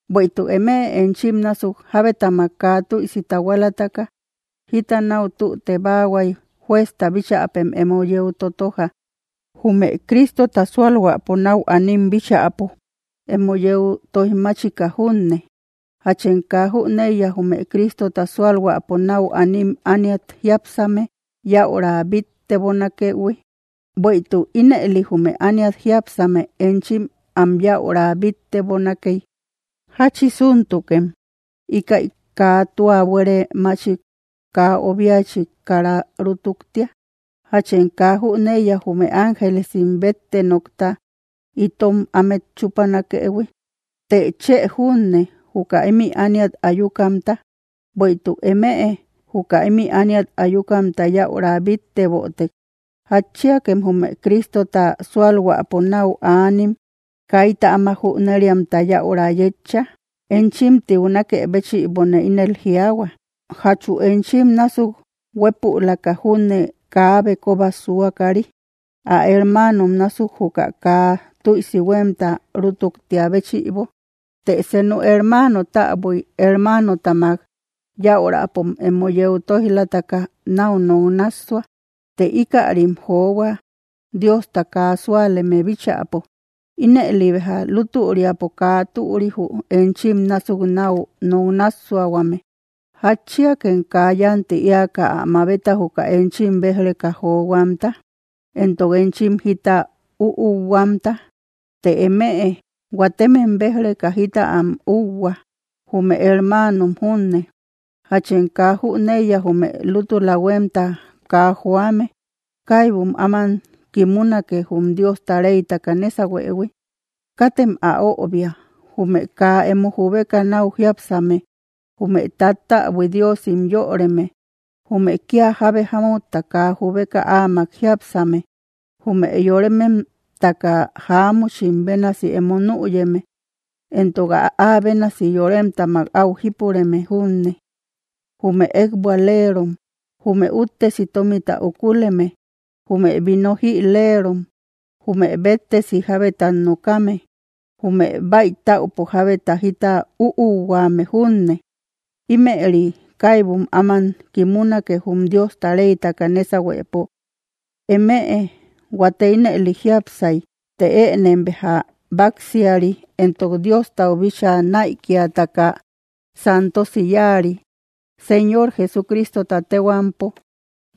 ¿Bueïtuk emëe enchim násuk jabetamak kaa tüisi tahualataka jita nau tüte baahuay juezta bichäpem emo yeu totoja, jume Cristota sualhuäpo nau anim bíchäpo emo yeu toijmachika junne? ¿Jachem kaa jüneiya jume Cristota sualhuäpo nau anim ániat jiápsame yäura bittebonakëhui? Buïetuk ínëli jume ániat jiápsame enchim am yäura bittebonakei, ¿jachisuntukem íkäi kaa tua buere machik kaa obiachik kara rutuktia? ¿Jachem kaa jüneiya jume ángelesim bette nokta itom amet chupanakëhui? ¿Të, chë junne, juka imï ániat ayukamta? Bueïtuk emëe juka imi ániat ayukamta yäura bittebotek, ¿jatchiakem jume Cristota sualhuäpo nau anim kayta áma júneriamta yäura yetcha? Enchim tiunakë béchïbone ínel jiaahua, ¿jachu enchim násuk huepülaka júne kaabe, kooba suakari, ä hermanom násuk juka kaa tüisi huemta rutuktia béchïbo? ¿Të senu hermano täbui hermanotamak yaurapom emo yeu toijlataka nau nok nassua, të íkärim johua Diosta kaa súaleme bíchäpo? Ínëli béja lutüriapo, kaa türi jü enchim násuk nau nok nassuahuame, ¿jatchiakem kaa yanti eaka ä mabeta juka enchim bej-reka johuamta? ¿Entok enchim jita úuhuamta? Të emëe huatemem bej‑reka jita am üuhua, jume hermanom junne. ¿Jachem kaa jüneiya jume lutüla huemta kaa joame, kaybum áman kimunake jum Diosta reytaka nesahuëhui? Katem ä öbia; jume kaa emo jubeka nau jiápsame, jume tattäbui diosim yöreme, jume kia jábe jámutta kaa jubeka áamak jiápsame, jume yorememtaka jáamuchim bénasi emo nüyeme, entok ä bénasi yoremtamak au jipureme junne. Jume ekbualerom, jume uttesi tomita ukuleme, jume vino jïlerom, jume béttesi jabetat nokame, jume baïtäupo jabeta jita üuhuame junne, imëri kaybum áman kimunake jum Diosta reytaka nesahuepo. Emëe huate ínëli jiápsay; të ënem béja baksiari, entok Diostau bíchaa naïkiataka santosi yáari, Señor Jesucristota tehuampo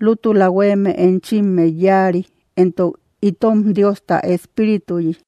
lútula hueme enchimet yáari, entok itom Diosta Espirituyi.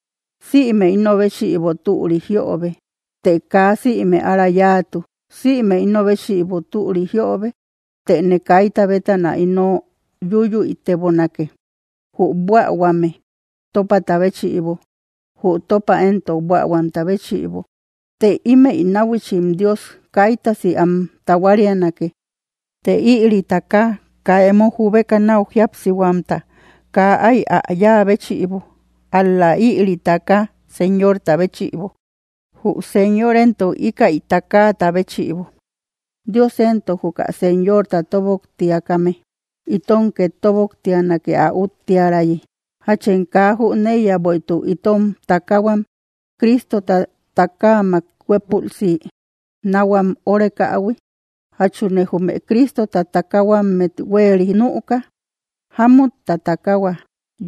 Sïme ino béchïbo türi jiobe, të kaa sïme ára yáatu; sïme ino béchïbo türi jiobe, tëne kayta bétana ino yuyüitebonake. Jü buähuame topata béchïbo, jü topa entok buähuamta béchïbo, të imey nahuichim Dios kaytasi am tahuarianake; të ïri takahua kaa emo jubeka nau jíapsihuamta kaa ay ä yáa béchïbo, ál‑la ïri taka Señorta béchïbo, jü Señor entok íkäi takaata béchïbo. Dios entok, juka Señorta toboktiakame, itom ket toboktianake ä úttiärayi. ¿Jachem kaa jüneíya bueïtuk itom takahuam, Cristota takaamak huépülsi nauhuam órekähui? ¿Jachune jume Cristota takahuammet hueri nüka, jámutta takahua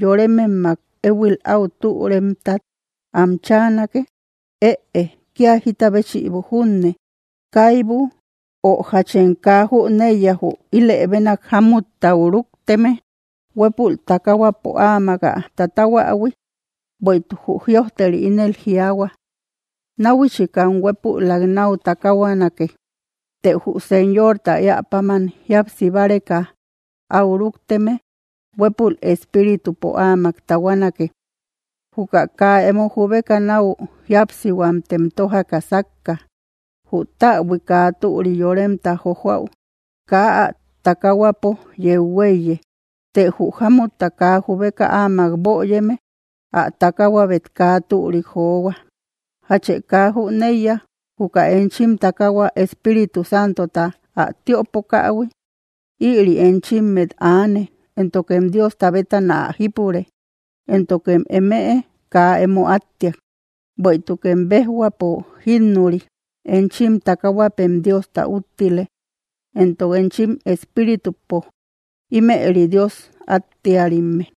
yorememmak ehuil au türemtat am chaanake? Ëe kia jita béchïbo junne, kaybu. ¿Ö jachem kaa jüneiya jü ilebenak jámuttau rukteme, huepul takahuapo áamak ä tatahuähui? Bueïtuk jü jïojteri ínel jiaahua: “Nahuichikam huépülak nau takahuanake.” Të jü Señorta eäpáman jíapsi báreka au rukteme, huepul espíritupo áamak tahuanake. Juka kaa emo jubeka nau jíapsihuamtem tojaka sakka, jü täbui kaa türi yoremta jojoau kaa ä takahuapo yeu huéiye, të jü jámutta kaa jubeka áamak böyeme, ä takahuabet kaa türik johua. ¿Jachë kaa jüneiya juka enchim takahua Espíritu Santota ä tiöpokähui, ïri enchimmet aane, éntokem Diosta bétana ä jípure, éntokem emëe kaa emo attiak? Bueïtukem bejhuapo jinnurï; enchin takahuäpem Diosta úttile, entok enchim espíritupo, ímëri Dios attiärimme.